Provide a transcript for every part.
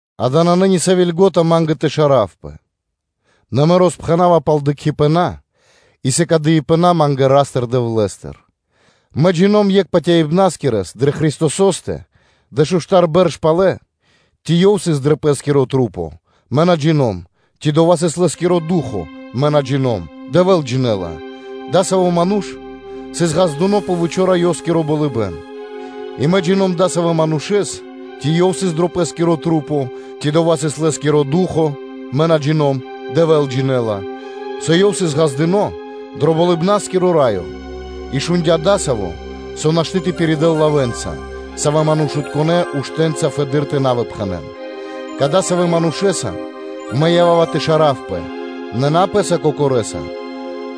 Ѓа́да, нанэ ни сави́ льго́та ма́нгэ тэ шаравпэ. Нэ мэ роспхэнава пал дыкхибэна и сыкадыипэна ма́нгэ Ра́стыр-Дэвлэ́стыр. Мэ джино́м екхэ́ патяибнаскирэс дрэ Христосо́стэ (дэшуштар бэрш палэ, ци ёв сыс дро пэ́скирэ маса́, мэ на джино́м, ци дова́ сыс лэ́скиро ду́хо (фа́но), мэ на джино́м, Дэвэ́л джинэ́ла); адасаво́ ману́ш сыс ґаздыно́ кэ три́то болыбэ́н. И мэ джино́м (джина́в) дасавэ́ манушэ́с, (ци ёв сыс дро пэ́скирэ маса́, ци дова́ сыс лэ́скиро ду́хо (фа́но) мэ на джино́м, Дэвэ́л джинэ́ла:) со ёв сыс ґаздыно́ дро Болыбна́скиро Раё, и шундя́ дасаво, со нашты́ тэ пиридэл лавэ́нца, савэ́ манушытконэ́ уштэ́нца фэды́р тэ на выпхэнэн. Кадасавэ́ манушэ́са мэ ява́ва тэ шаравпэ, нэ на пэ́са кокорэса,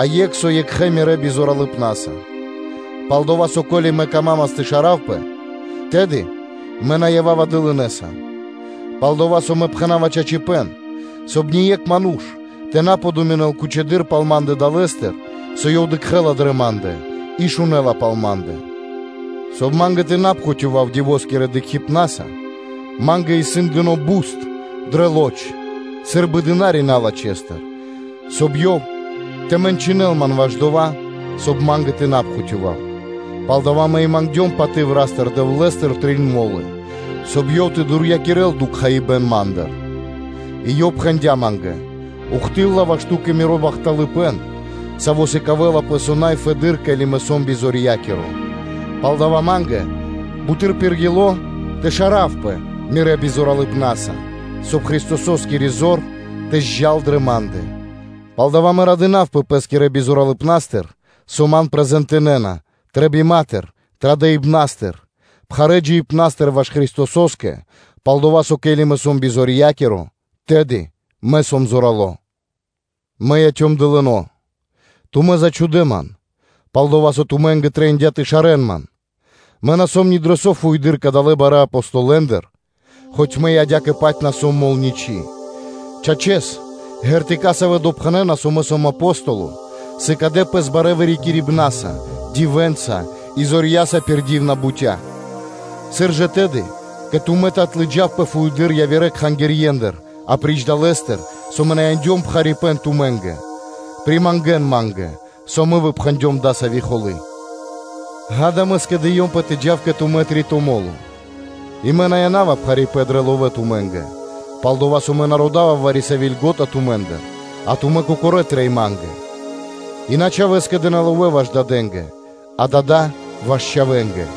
а екх со екхэ́ мирэ́ бизоралыпна́са. Пал-дова́ со, ко́ли мэ камамас тэ шаравпэ, тэды мэ на ява́ва дылынэса. Пал-дова́ со мэ пхэна́ва чачипэ́н, соб (кай) ние́кх ману́ш тэ на подуминэл кучэдыр пал ма́ндэ далэ́стыр, со ёв дыкхэ́ла дрэ ма́ндэ и шунэ́ла пал ма́ндэ. Соб (кай) ма́нгэ тэ на пхутёвав дивоскирэ дыкхибнаса, ма́нгэ исын дыны́ пхусады́ буст (колючка) дрэ лоч сы́рбы дына́ри (слу́га) налачхэ́стыр, соб (кай) ёв тэ мэнчынэл ман ваш дова́, соб (кай) ма́нгэ тэ на пхутёвав. Палдава́ мэ и мангдём паты́в Ра́стыр-Дэвлэ́стыр трин мо́лы, соб (кай) Ёв тэ дурьякирэл буст ма́ндыр. И Ёв пхэндя́ ма́нгэ: “Ухты́лла (до́си) ваш ту́кэ Миро бахталыпэ́н, саво́ сыкавэлапэ со най фэдэды́р, ке́ли мэ сом бизорья́киро!” Палдава́ ма́нгэ буты́р пир ило́ тэ шаравпэ мирэ́ бизоралыпнаса, соб (кай) Христососкири зор тэ заджа́л дрэ ма́ндэ. Палдава́ мэ радынавпэ пэ́скирэ бизоралыпнастыр, со ман ладжакирэна; трэбиматыр, традыпнастыр, пхарэ́ джиибнастыр ваш Христосо́скэ, пал-дова́ со, ке́ли мэ сом бизорья́киро, тэды мэ сом зорало́. Мэ яцём дылыно́, тумэ́ зачхудэ ман: пал-дова́ со тумэ́нгэ трэиндя́ тэ шарэ́н ман; мэ на сом ни дро со фуеды́р кадалэ́ барэ́ Апостолэндыр, хоць мэ и адя́кэ-паць на сом мол ничы́. Чачэс, ґэртыка (знаме́нии), савэ́ допхэнэна, со мэ сом Апостоло, сыкадэ пэс барэ́ вырикирибнаса, дивэнца и зорья́са пир ди́вна бутя́. Сыр жа тэды кэ тумэ́ тэ отлыджавпэ фуеды́р явирэ кхангирьендыр, апри́ч дова́, со мэ на яндём пхарипэ́н тумэ́нгэ. Примангэн ма́нгэ, со мэ выпхэндём дасави́ холы́. Ѓа́да, мэ скэдыёмпэ тэ джав кэ тумэ́ три́то мо́ло. И мэ на яна́ва пхарипэ́н дрэ ловэ́ тумэ́нгэ, пал-дова́ со мэ на родава вари-сави́ льго́та тумэ́ндыр, а тумэ́ кокорэ́ трэй ма́нгэ. И на чхавэ́ скэдэ́на ловэ́ ваш дадэ́нгэ, а дада́ ваш чхавэ́нгэ.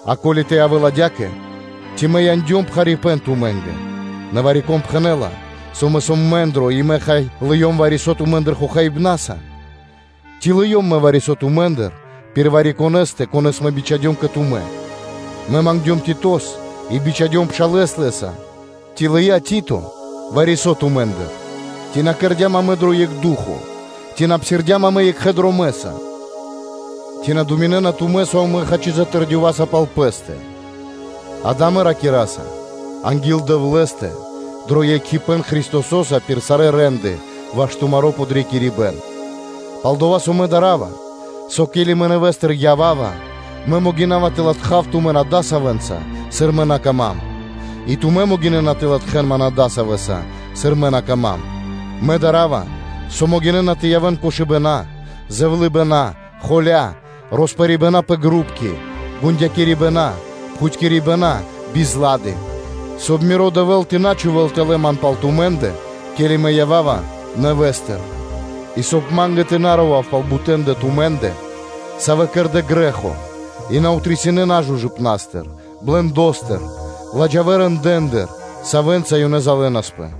А ко́ли тэ явэ́л адя́кэ, ци мэ яндём пхарипэ́н тумэ́нгэ? Нэ вари-кон пхэнэ́ла, со мэ сом мэндро, и мэ, хай, лыём вари-со тумэ́ндыр хохаибнаса? Ци лыём мэ вари-со тумэ́ндыр пир вари-конэ́стэ, конэ́с мэ бичхадём кэ тумэ́? Мэ мангдём Титос и бичхадём пшалэ́с лэ́са: ци лыя́ Тито вари-со тумэ́ндыр? Ци на кэрдя́м амэ дро екх ду́хо (фа́но)? Ци на псирдям амэ екхэ дромэ́са? Ци думинэ́на тумэ́, со амэ, хачи, затэрдёваса пал пэ́стэ? Дава́ амэ ракираса анги́л Дэвлэ́стэ дро екхипэ́н Христосо́са пир сарэ́ рэ́нды ваш тумаро́ подрикирибэ́н. Пал-дова́ со мэ дарава, со, ке́ли мэ нэвэ́стыр ява́ва, мэ могина́ва тэ латхав тумэн адасавэнца, сыр мэ на кама́м, и тумэ́ могинэ́на тэ латхэ́н ман адасавэса, сыр мэ на кама́м: мэ дарава, со могинэ́на тэ явэ́н кошыбэна, зэвлыныпэна, холякирибэна, роспэрибэна пэ групки, гундякирибэна, пхутькирибэна, бизлады; соб (кай) миро Дэвэ́л тэ на́ чхувэ́л тэлэ́ ман пал тумэ́ндэ, ке́ли мэ ява́ва нэвэ́стыр, и, соб (кай) ма́нгэ тэ на рова́в пал бутэ́ндэ тумэ́ндэ, савэ́ кэрдэ́ грэ́хо и на отрисинэ нажужыпнастыр, биладжаипнастыр, ладжавэ рэндэ́ндыр, савэ́нца ёнэ залэнаспэ.